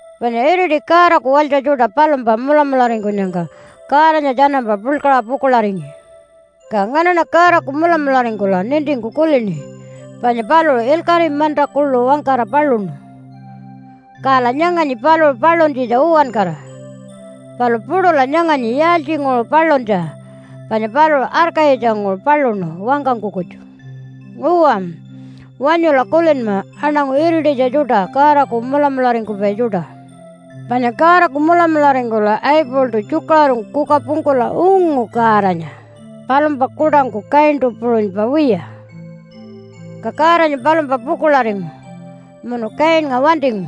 Panya iriti Godaku walytja tjuṯa palumpa mulamularingkunyangka Godanya tjanampa puḻkaṟa pukuḻaringi. Ka nganaṉa Godaku mulamularingkula nintingku kulini panya paluṟu ilkaṟi manta kuḻu wangkara paluṉu. Kala nyanganyi paluṟu paluntjitja uwankara, palu puṯula nyanganyi yaaltjinguṟu paluntja, panya paluṟu arkayitjanguṟu paluṉu wangkangku kutju. Uwa, wanyula kulinma aṉangu irititja tjuṯa Godaku mulamularingkupai tjuṯa. Abelnga Panya Godaku mulamularingkula Abeltu tjukaṟurungku kuka pungkula ungu Godanya palumpa kuṯangku Kaintu puṟunypa wiya. Ka Godanya palumpa pukuḻaringu munu Kainnga wantingu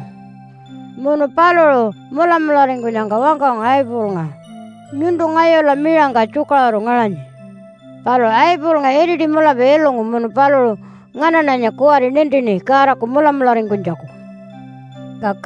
munu paluṟu mulamularingkunyangka wangkangu Abelnga, “Nyuntu ngayula miṟangka tjukaṟuru ngaṟanyi.” Palu Abelnga iriti mulapa ilungu munu paluṟu nganaṉanya kuwari nintini Godaku mulamularingkunytjaku. Iinakanya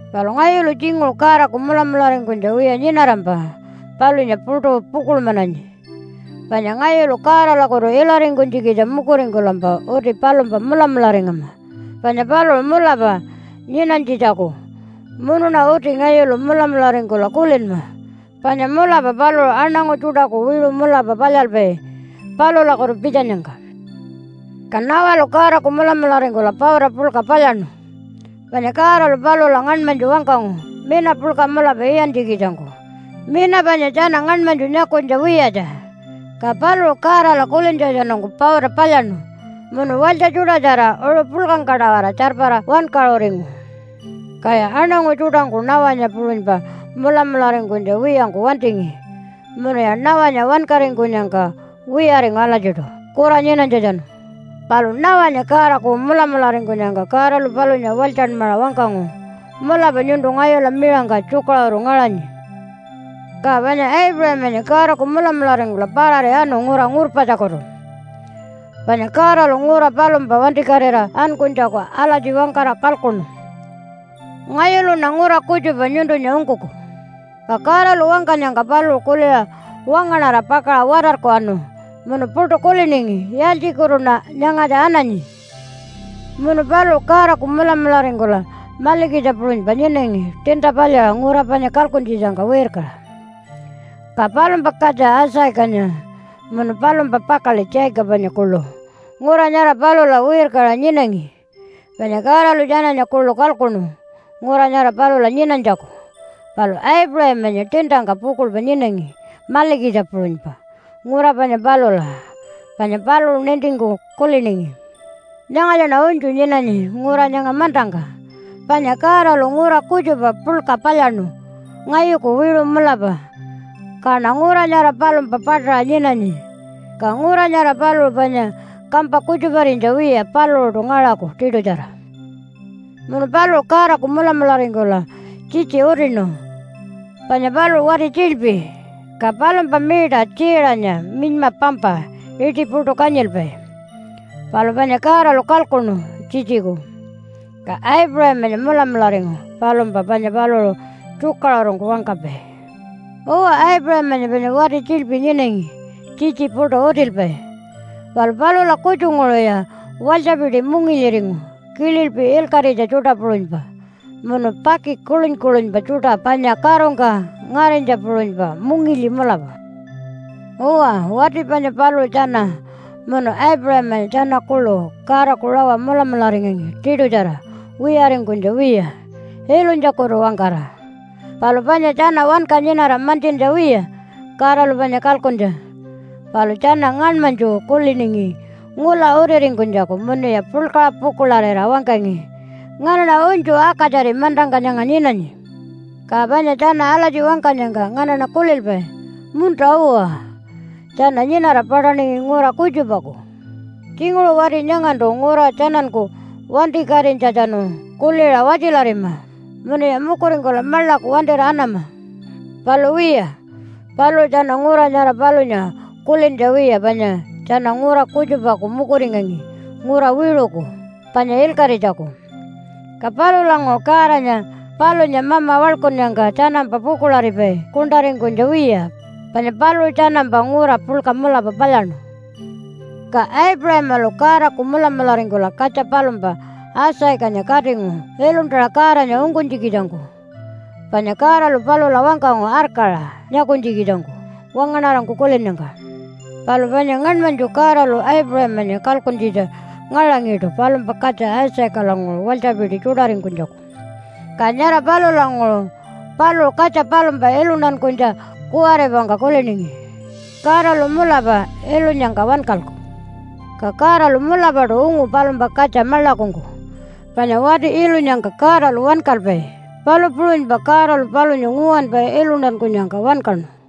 Palu ngayulu tjinguṟu Godaku mulamularingkunytja wiya nyinarampa palunya puṯu pukuḻmananyi. Panya ngayulu Godalakutu ilaringkunytjikitja mukuringkulampa uti palumpa mulamularingama panya paluṟu mulapa nyinanytjitjaku, munuṉa uti ngayulu mulamularingkula kulinma panya mulapa paluṟu aṉangu tjuṯaku wiṟu mulapa palyalpai palulakutu pitjanyangka. Noah-nya Ka Noah-lu Godaku mulamularingkula pauta puḻka palyaṉu, panya Godalu palula ngaṉmanytju wangkangu mina puḻka mulapa iyantjikitjangku, mina panya tjana ngaṉmanytju nyakunytja wiyatja. Ka paluṟu Godala kulintjatjanungku pauta palyaṉu munu walytja tjuṯatjara uṟu puḻkangka-tawara tjarpara wankaṟuringu. Kaya aṉangu tjuṯangku Noah-nya puṟunypa mulamularingkunytja wiyangku wantingi, munuya Noah-nya wankaringkunyangka wiyaringu alatjiṯu kura nyinanytjatjanu. Palu Noah-nya Godaku mulamularingkunyangka Godalu palunya walytjanmaṟa wangkangu, “Mulapa nyuntu ngayula miṟangka tjukaṟuru ngaṟanyi.” Aipuṟamanya Ka panya Aipuṟamanya Godaku mulamularingkula parari anu ngura ngurpatjakutu. Panya Godalu ngura palumpa wantikatira ankunytjaku alatji wangkara kalkuṉu, “Ngayuluṉa ngura kutjupa nyuntunya ungkuku.” Ka Godalu wangkanyangka paluṟu kuliṟa wangaṉara pakaṟa watarku anu munu puṯu kuliningi, “Yaaltjikutuṉa nyangatja ananyi?” Munu paluṟu Godaku mulamularingkula malikitja puṟunypa nyinangi tiinta palyaṟa ngura panya kalkuntjitjangka wirkaṟa. Ka palumpa katja Isaacanya munu palumpa pakaḻi Jacobanya kuḻu ngura nyara palula wirkaṟa nyinangi, panya Godalu tjananya kuḻu kalkuṉu ngura nyara palula nyinanytjaku. Palu Aipuṟamanya tiintangka pukuḻpa nyinangi malikitja puṟunypa ngura panya palula panya paluṟu nintingku kuliningi, “Nyangatjaṉa unytju nyinanyi ngura nyanga mantangka, panya Godalu ngura kutjupa puḻka palyaṉu ngayuku wiṟu mulapa, kaṉa ngura nyara palumpa paṯaṟa nyinanyi. Ka ngura nyara paluṟu panya kampa kutjuparinytja wiya paluṟuṯu ngaṟaku tiṯutjara.” Munu paluṟu Godaku mulamularingkula tjitji utinu, panya paluṟu wati tjiḻpi ka palumpa miita Tjiiṟanya minyma pampa iṯi puṯu kanyilpai. Palu panya Godalu kalkuṉu tjitjiku, ka Aipuṟamanya mulamularingu palumpa panya paluṟu tjukaṟurungku wangkapai. Uwa, Aipuṟamanya panya wati tjiḻpi nyinangi tjitji puṯu utilpai, palu palula kutjunguṟuya walytjapiti mungilyiringu kililpi ilkaṟitja tjuṯa puṟunypa, munu paki kuḻuny-kuḻunypa tjuṯa panya karungka ngarinytja puṟunypa, mungilyi mulapa. Uwa, wati panya paluṟu tjana munu Aipuṟamanya tjana kuḻu Godaku rawa mulamularingangi tiṯutjara wiyaringkunytja wiya ilunytjakutu-wangkara. Palu panya tjana wanka nyinara mantjintja wiya Godalu panya kalkuntja. Palu tjana ngaṉmanytju kuliningi ngula utiringkunytjaku munuya puḻkaṟa pukuḻarira wangkangi, “Nganaṉa unytju akatjari mantangka nyanga nyinanyi.” Ka panya tjana alatji wangkanyangka nganaṉa kulilpai, “Munta-uwa, tjana nyinara paṯaningi ngura kutjupaku.” Tjinguṟu wati nyangantu ngura tjananku wantikatinytjatjanu kuliṟa watjilarima, munuya mukuringkula maḻaku wantira anama. Palu wiya, paluṟu tjana ngura nyara palunya kulintja wiya panya tjana ngura kutjupaku mukuringangi ngura wiṟuku, panya ilkaṟitjaku. Ka palulanguṟu Godanya palunya Mama waḻkunnyangka tjanampa pukuḻaripai kuṉṯaringkunytja wiya, panya paluṟu tjanampa ngura puḻka mulapa palyaṉu. Ka Aipuṟamalu Godaku mulamularingkula katja palumpa Isaacanya katingu iluntaṟa Godanya ungkunytjikitjangku. Panya Godalu palula wangkangu arkaṟa nyakunytjikitjangku wangaṉarangku kulinnyangka. Palu panya ngaṉmanytju Godalu Aipuṟamanya kalkuntjitja ngaṟangiṯu palumpa katja Isaacalanguṟu walytjapiti tjuṯaringkunytjaku. Ka nyara palulanguṟu paluṟu katja palumpa iluntankunytja kuwaripangka kuliningi, “Godalu mulapa ilunyangka wankalku.” Ka Godalu mulapaṯu ungu palumpa katja maḻakungku. Panya wati ilunyangka Godalu wankalpai, palu puṟunypa Godalu palunya nguwanpa iluntankunyangka wankaṉu. Isaacanya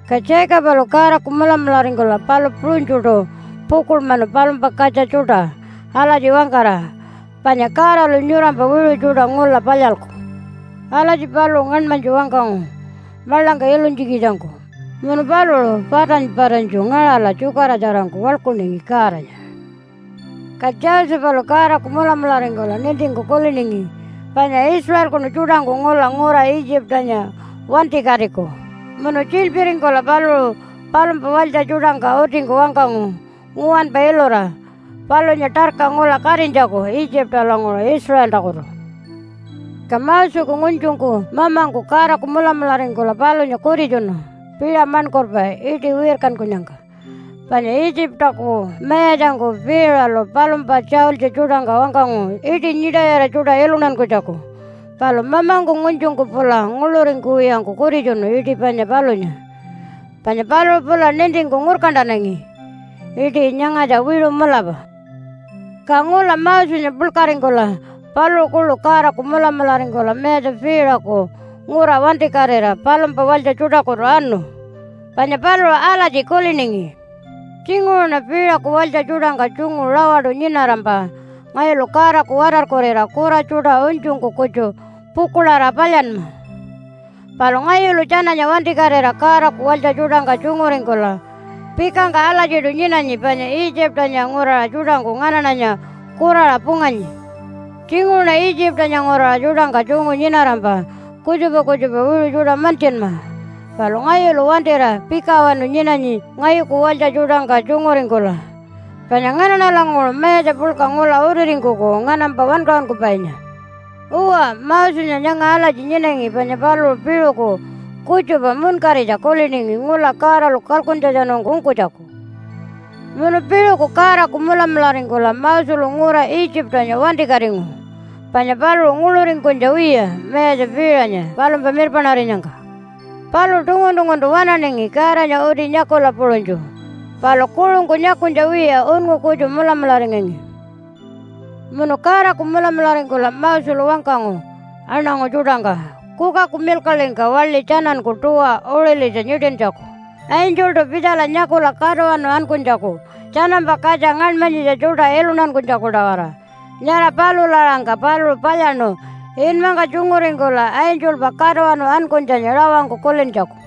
Ka Jacobalu Godaku mulamularingkula palu puṟunytjuṯu pukuḻmanu palumpa katja tjuṯa alatji wangkara, “Panya Godalu nyurampa wiṟu tjuṯa ngula palyalku.” Alatji paluṟu ngaṉmanytju wangkangu maḻangka ilunytjikitjangku. Munu paluṟu patany-patanytju ngaṟala tjukaratjarangku waḻkuningi Godanya. Josephanya Ka Josephalu Godaku mulamularingkula nintingku kuliningi panya Israelkunu tjuṯangku ngula ngura Itjipanya wantikatiku. Munu tjiḻpiringkula paluṟu palumpa walytja tjuṯangka utingku wangkangu nguwanpa ilura palunya tarka ngula katinytjaku Itjipalanguṟu Israeltakutu. Mosenya Ka Moseku ngunytjungku mamangku Godaku mulamularingkula palunya kutitjunu piṟa maṉkurpa iṯi wirkankunyangka. Panya Itjipaku mayatjangku Piiṟalu palumpa tjaultji tjuṯangka wangkangu iṯi nyiṯayira tjuṯa iluntankunytjaku. Palu mamangku ngunytjungku pula nguḻuringkuwiyangku kutitjunu iṯi panya palunya, panya paluṟu pula nintingku ngurkantanangi, “Iṯi nyangatja wiṟu mulapa.” Ka ngula Mosenya puḻkaringkula paluṟu kuḻu Godaku mulamularingkula Mayatja Piiṟaku ngura wantikatira palumpa walytja tjuṯakutu anu. Panya paluṟu alatji kuliningi, “Tjinguṟuṉa Piiṟaku walytja tjuṯangka tjungu rawaṯu nyinarampa ngayulu Godaku watarkurira kura tjuṯa unytjungku kutju pukuḻarira palyanma. Palu ngayulu tjananya wantikatira Godaku walytja tjuṯangka tjunguringkula pikangka alatjiṯu nyinanyi panya Itjipanya nguraṟa tjuṯangku nganaṉanya kuraṟa punganyi. Tjinguṟuṉa Itjipanya nguraṟa tjuṯangka tjungu nyinarampa kutjupa kutjupa wiṟu tjuṯa mantjinma. Palu ngayulu wantira pikawanu nyinanyi ngayuku walytja tjuṯangka tjunguringkula, panya nganaṉalanguṟu mayatja puḻka ngula utiringkuku nganampa wankaṟunkupainya.” Uwa, Mosenya nyanga alatji nyinangi panya paluṟu piṟuku kutjupa munkaritja kuliningi ngula Godalu kalkuntjatjanungku ungkunytjaku. Munu piṟuku Godaku mulamularingkula Moselu ngura Itjipanya wantikatingu. Panya paluṟu nguḻuringkunytja wiya Mayatja Piiṟanya palumpa mirpaṉarinyangka. Paluṟu tungun-tunguntu waṉaningi Godanya uti nyakula puṟunytju. Palu kuṟungku nyakunytja wiya unngu kutju mulamularingangi. Munu Godaku mulamularingkula Moselu wangkangu aṉangu tjuṯangka kukaku milkaḻingka waḻi tjananku tuwa uṟilitja nyiṯintjaku angeltu pitjala nyakula katuwanu ankunytjaku tjanampa katja ngaṉmanyitja tjuṯa iluntankunytjaku-tawara. Nyara palula aṟangka paluṟu palyaṉu inmangka tjunguringkula angelpa katuwanu ankunytjanya rawangku kulintjaku.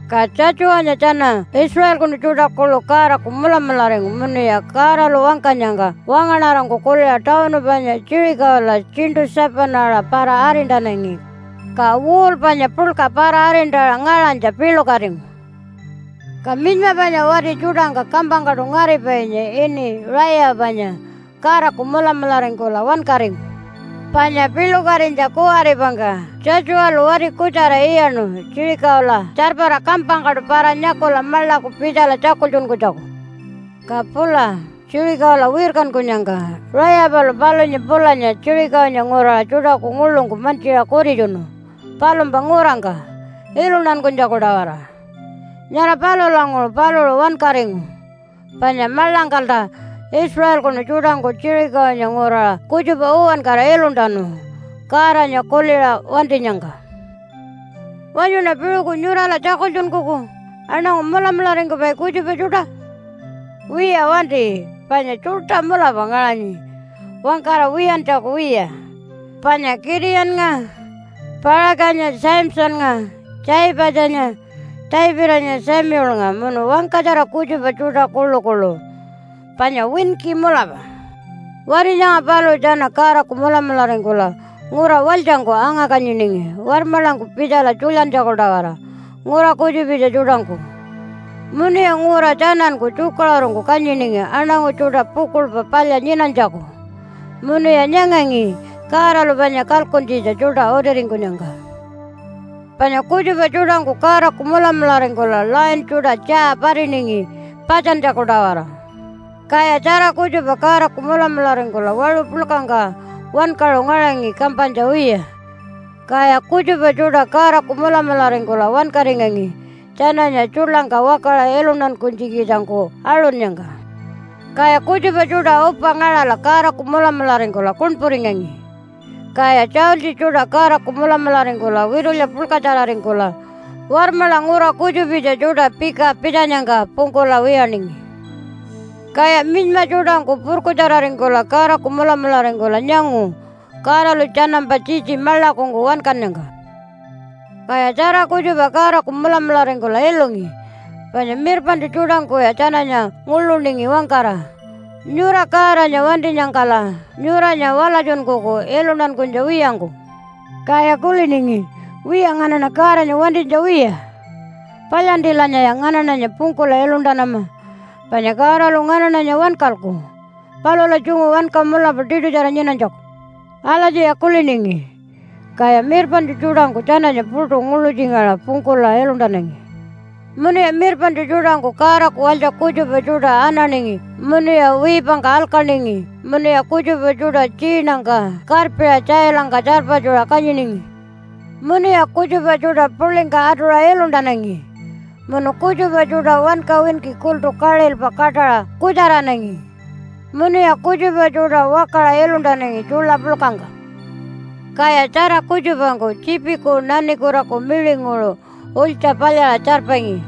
Ka Tjatjuwanya tjana Israelkunu tjuṯa kuḻu Godaku mulamularingu munuya Godalu wangkanyangka wangaṉarangku kuliṟa tawunu panya Jerichola tjiṉṯu 7-aṟa para-arintanangi, ka wall panya puḻka para-arintaṟa ngaṟanytja piḻukatingu. Rayapanya Ka minyma panya wati tjuṯangka kampangkaṯu ngaripainya ini Rayapanya Godaku mulamularingkula wankaringu. Panya piḻukatinytja kuwaripangka Tjatjuwalu wati kutjara iyaṉu Jerichola tjarpara kampangkaṯu para-nyakula maḻaku pitjala tjakultjunkunytjaku. Ka pula Jerichola wirkankunyangka, Rayapalu palunya pulanya Jerichonya nguraṟa tjuṯaku nguḻungku mantjiṟa kutitjunu palumpa ngurangka iluntankunytjaku-tawara. Nyara palulanguṟu paluṟu wankaringu, panya maḻangkalta Israelkunu tjuṯangku Jerichonya nguraṟa kutjupa uwankara iluntanu Godanya kuliṟa wantinyangka. Wanyuṉa piṟuku nyurala tjakultjunkuku aṉangu mulamularingkupai kutjupa tjuṯa? Wiya wanti, panya tjuṯa mulapa ngaṟanyi wangkara wiyantjaku wiya, panya Kitiyannga, Paṟakanya, Samsonnga, Tjaipatjanya, Davidanya, Samuelnga munu wangkatjara kutjupa tjuṯa kuḻukuḻu panya winki mulapa. Wati nyanga paluṟu tjana Godaku mulamularingkula ngura walytjangku anga-kanyiningi warmaḻangku pitjala tjulyantjaku-tawara ngura kutjupitja tjuṯangku. Munuya ngura tjananku tjukaṟurungku kanyiningi aṉangu tjuṯa pukuḻpa palya nyinanytjaku. Munuya nyangangi Godalu panya kalkuntjitja tjuṯa utiringkunyangka. Panya kutjupa tjuṯangku Godaku mulamularingkula lion tjuṯa tjaa patiningi patjantjaku-tawara. Kaya tjara kutjupa Godaku mulamularingkula waṟu puḻkangka wankaṟu ngaṟangi kampanytja wiya. Kaya kutjupa tjuṯa Godaku mulamularingkula wankaringangi tjananya tjuḻangka wakaṟa iluntankunytjikitjangku aṟunnyangka. Kaya kutjupa tjuṯa upa ngaṟala Godaku mulamularingkula kuṉpuringangi. Kaya tjaultji tjuṯa Godaku mulamularingkula witulya puḻkatjararingkula warmaḻa ngura kutjupitja tjuṯa pika pitjanyangka pungkula wiyaningi. Kaya minyma tjuṯangku purkutjararingkula Godaku mulamularingkula nyangu Godalu tjanampa tjitji maḻakungku wankannyangka. Kaya tjara kutjupa Godaku mulamularingkula ilungi, panya mirpaṉtju tjuṯangkuya tjananya nguḻuningi wangkara, “Nyura Godanya wantinyangkala nyuranya walatjunkuku iluntankunytja wiyangku.” Kaya kuliningi, “Wiya, nganaṉa Godanya wantinytja wiya. Palyantilanyaya nganaṉanya pungkula iluntanama panya Godalu nganaṉanya wankalku palula tjungu wanka mulapa tiṯutjara nyinanytjaku.” Alatjiya kuliningi, kaya mirpaṉtju tjuṯangku tjananya puṯu nguḻutjingaṟa pungkula iluntanangi. Munuya mirpaṉtju tjuṯangku Godaku walytja kutjupa tjuṯa ananingi, munuya wiipangka alkaningi, munuya kutjupa tjuṯa tjiinangka karpiṟa tjailangka tjarpatjuṟa kanyiningi. Munuya kutjupa tjuṯa puḻingka atuṟa iluntanangi, munu kutjupa tjuṯa wanka winki kultu kaṟilpa kaṯaṟa kutjaranangi, munuya kutjupa tjuṯa wakaṟa iluntanangi tjuḻa puḻkangka. Kaya tjara kutjupangku tjiipiku nanikutaku miṟinguṟu ulytja palyaṟa tjarpangi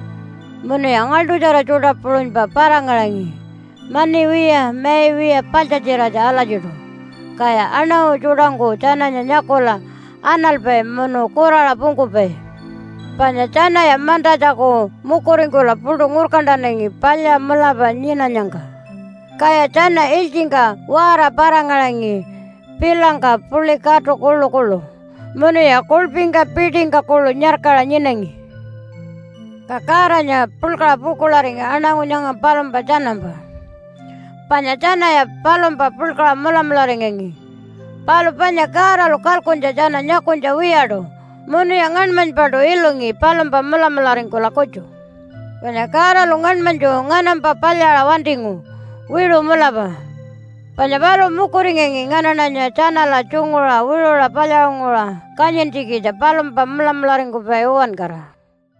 munuya ngaḻṯutjara tjuṯa puṟunypa para-ngaṟangi mani wiya mai wiya paḻtjatjiratja alatjiṯu. Kaya aṉangu tjuṯangku tjananya nyakula analpai munu kuraṟa pungkupai. Panya tjanaya mantatjaku mukuringkula puṯu ngurkantanangi palya mulapa nyinanyangka. Kaya tjana ilytjingka waara para-ngaṟangi pilangka puḻi katu kuḻukuḻu. Munuya kuḻpingka piṯingka kuḻu nyarkaṟa nyinangi. Ka Godanya puḻkaṟa pukuḻaringi aṉangu nyanga palumpa tjanampa, panya tjanaya palumpa puḻkaṟa mulamularingangi. Palu panya Godalu kalkuntja tjana nyakunytja wiyaṯu munuya ngaṉmanypaṯu ilungi palumpa mulamularingkula kutju. Panya Godalu ngaṉmanytju nganampa palyaṟa wantingu wiṟu mulapa. Panya paluṟu mukuringangi nganaṉanya tjanala tjunguṟa wiṟuṟa palyaṟunguṟa kanyintjikitja palumpa mulamularingkupai uwankara.